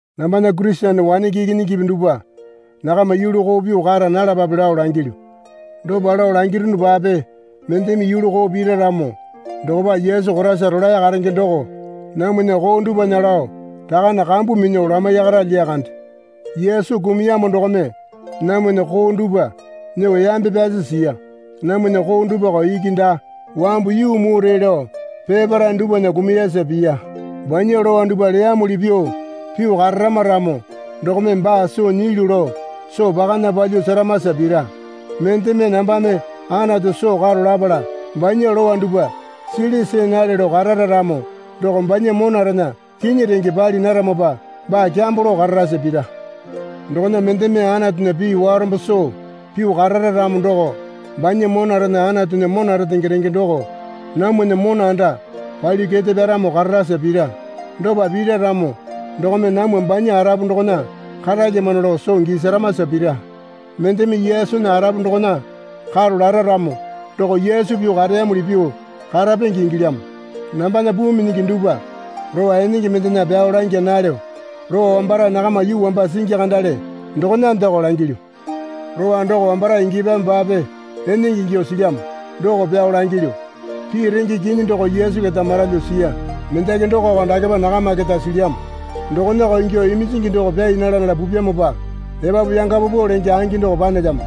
Nambana Kurisene wanenge ikinyingipi dupwa, nakama yulu koo pyuo kara nalapape lao langilyu. Dopa lao langirunupape mendeme yulu koo pira ramo dokopa Yesu Koraisa rolae karenge doko namwana koo dupwana lao Rakane kambu minyuo lamaiyakara lyakande. Yesu kumuyamo dokome namwana koo dupwa nyuo yambe pyasi siya. Namwana koo dupwako iki daa. Wambu yuu mure lao peparae dupwana kumuyasa piya. Banya lowa dupwa leyamuli pyuo pyuo kararama ramo dokome baa soo nyilyu lao soo pakana palyuo seramasa pira. Mendeme, Nambame Anatu soo karo lapala banya lowa dupwa sili see nale lao karara ramo doko banya monarena kinyi renge pali naramopa baa kyambo lao kararasa pira. Dokona mendeme Anatunya pii warombo soo pyuo karara ramo doko banya monarena Anatunya mona retenge renge doko namwana mona anda palyuo kete pyaramo kararasa pira. Dopa pira ramo dokome namwa banya arapu dokona karalyamano lao soo gisaramasa pira. Mendeme Yesunya arapu dokona karo lara ramo doko Yesu pyuo kareyamuli pyuo karapenge ingilyamo. Nambana puu minyingi dupwa lowa enenge mendena pyao langya nalyo. Lowa wambarae nakama yuu wamba singi kandale dokonandeko langilyu. Lowa doko wambarae ingyapyamopape enenge ingyuo silyamo doko pyao langilyu. Pii renge kinyi doko Yesu keta maralyuo siya. Mendaki dokoko dakepa nakama keta silyamo. Dokonako ingyuo iminjingi doko pyai nala nala pupyamopa epapu yanga paupau lenge angi doko panelyamo.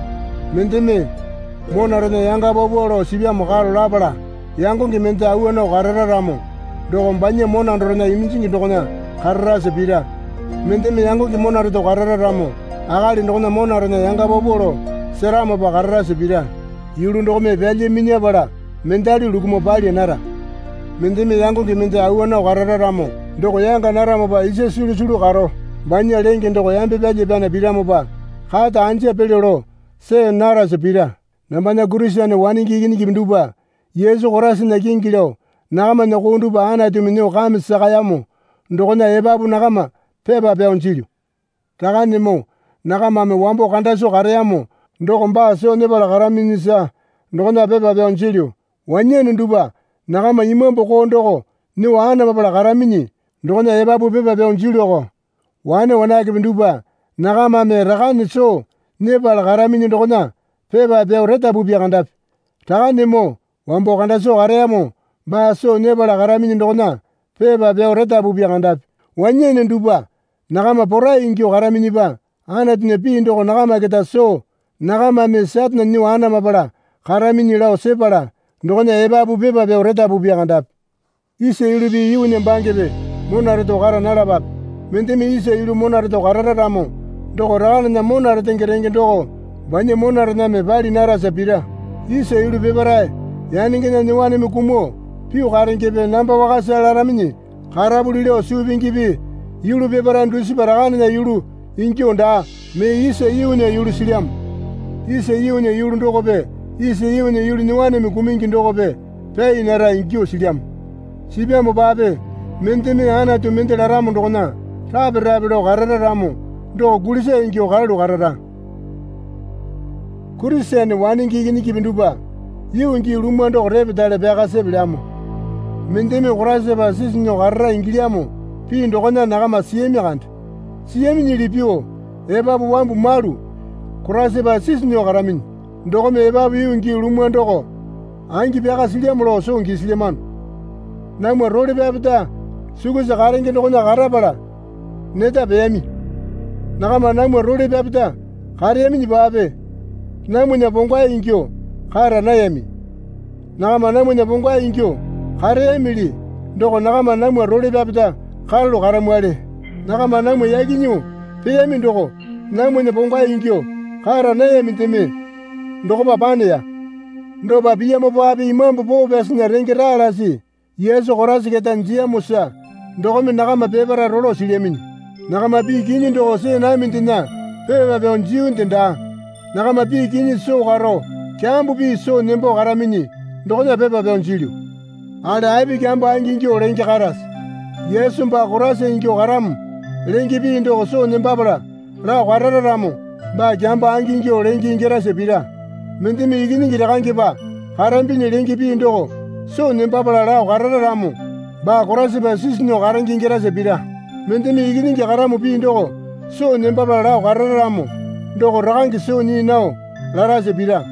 Mendeme, Monarena yanga paupau lao sipyamo karo lapala yangonge mende awa nao karara ramo doko banya mona dorena iminjingi dokona kararasa pira. Mendeme yangonge mona reto karara ramo akali dokona monarena yanga paupau lao seramopa kararasa pira. Yulu dokome pyalya minyapala mendali lukumuo palya nara. Mendeme yangonge mende awa nao karara ramo doko yanga naramopa isa sulusulu karo banya lenge doko yambe pyalya pyana piramopa kata anja pelyo lao see narasa pira. Nambana Kurisene wanenge ikinyingipi dupwa, Yesu Koraisana kingi lao nakamana koo dupwa Anatumi nyuo kame sakayamo dokona epapu nakama pepa pyao jilyu. Rakanemoo nakamame wambo kanda soo kareyamo doko baa soo nyepala karaminyisa dokona pepa pyao jilyu. Wanyane dupwa nakama imambu koo doko nyuo anamapala karaminyi dokona epapu pepa pyao jilyuko. Wane wanakepe dupwa nakamame Rakane soo nyepala karaminyi dokona pepa pyao retapupya kandapi. Rakanemoo, wambo kanda soo kareyamo baa soo nyepala karaminyi dokona pepa pyao retapupya kandapi. Wanyane dupwa nakama porai ingyuo karaminyipa Anatunya pii doko nakama keta soo nakamame Satane nyuo anamapala karaminyi lao sepala dokona epapu pepa pyao retapupya kandapi. Isa yulupi yuunya bangepe mona reto kara nalapape. Mendeme isa yulu mona reto karara ramo doko Rakanena mona retenge renge doko banya monarename pali narasa pira. Isa yulu peparae yanengena nyuowaneme kumuo pyuo karengepe namba wakasa laraminyi karapuli lao suu pingipi yulu peparae dusipa Rakanena yulu ingyuo daa mee isa yuunya yulu silyamo. Isa yuunya yulu dokope isa yuunya yulu nyuowaneme kumungi dokope pyai nara ingyuo silyamo. Sipyamopape mendeme Anatu mende laramo dokona rape rape lao karara ramo doko kulisa ingyuo karalu karara. Kurisene wanenge ikinyingipi dupwa yuu gii lumwa doko repetale pyaka sepelyamo. Mendeme Koraisapa sisu nyuo karara ingilyamo pii dokona nakama siyami kande. Siyaminyili pyuo epapu wambu malu Koraisapa sisu nyuo karaminyi. Dokome epapu yuu gii lumwa doko angi pyaka silyamo lao soo gisilyamano. Namwa role pyapeta sukusa karenge dokona karapala neta peyami. Nakama namwa role pyapeta kareyaminyipape namwana pongwae ingyuo kara nayami. Nakama namwana pongwae ingyuo kareyamili doko nakama namwa role pyapeta karalu karamwali. Nakama namwa yaki nyuo peyami doko namwana pongwae ingyuo kara nayamindeme dokopa paneya. Dopa piyamopape Imambu Poo Pyasinya renge raa lasi Yesu Koraisa keta jiyamosa dokome nakama peparae rolo silyaminyi. Nakama pii kinyi doko see namindena pepa pyao jiyunde daa. Nakama pii kinyi soo karo kyambo pii soo nembo karaminyi dokona pepa pyao jilyu. Akali api kyambo angingyuo lenge karase? Yesu baa Koraisa ingyuo karamo lenge pii doko soo nembapala lao karara ramo baa kyambo angingyuo lenge ingyarasa pira. Mendeme Ikinyingi Rakangepa karambinyi lenge pii doko soo nembapala lao karara ramo baa Koraisapa sisu nyuo karenge ingyarasa pira. Mendeme Ikinyingi karamo pii doko soo nembapala lao karara ramo doko Rakange soo nyii nao larasa pira.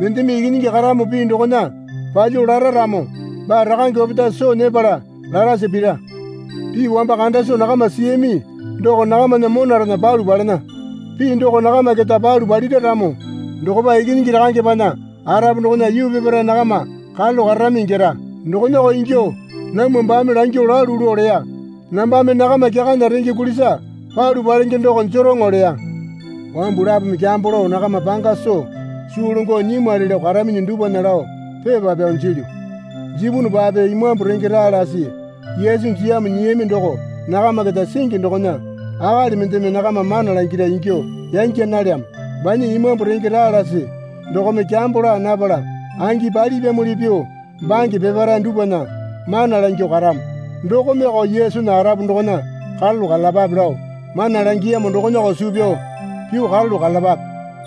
Mendeme Ikinyingi karamo pii dokona palyuo lara ramo baa Rakange opetae soo nyepala larasa pira. Pii wamba kanda soo nakama siyami doko nakamana monarena palu palena. Pii doko nakama keta palu palira ramo dokopa Ikinyingi Rakangepana arapu dokona yuu peparae nakama karalu kararami ingyara. Dokonako ingyuo namwa baame langyuo lalu lao leya. Nambame nakama kyakana renge kulisa palu palenge doko jeroŋo leya. Wambu lapome kyambo lao nakama panga soo suu longo nyimwali lao karaminyi dupwana lao pepa pyao jilyu. Jipunupape Imambu renge raa lasi Yesu jiyamo nyiyami doko nakama keta singi dokona akali mendeme nakama mana langira ingyuo yangya nalyamo. Banya Imambu renge raa lasi dokome kyambo laa napala angi palipyamuli pyuo bange peparae dupwana mana langyuo karamo. Dokomeko Yesunya arapu dokona karalu karalapape lao mana langiyamo dokonako suu pyao pyuo karalu karalapape.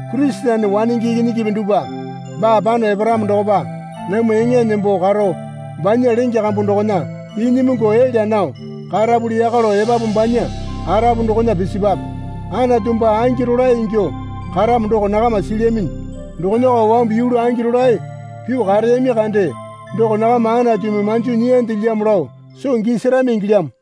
Kurisene wanenge ikinyingipi dupwa baa pano eparamo dokopa namwa eŋa nembo karo banya lenge kambu dokona inyimungu elya nao karapuli yaka lao epapu banya arapu dokona pisipwape. Anatu baa angi rolae ingyuo karamo doko nakama silyaminyi. Dokonako wambu yulu angi rolae pyuo kareyami kande doko nakama Anatumi manjo nyiyandelyamo lao soo gisarami ingilyamo.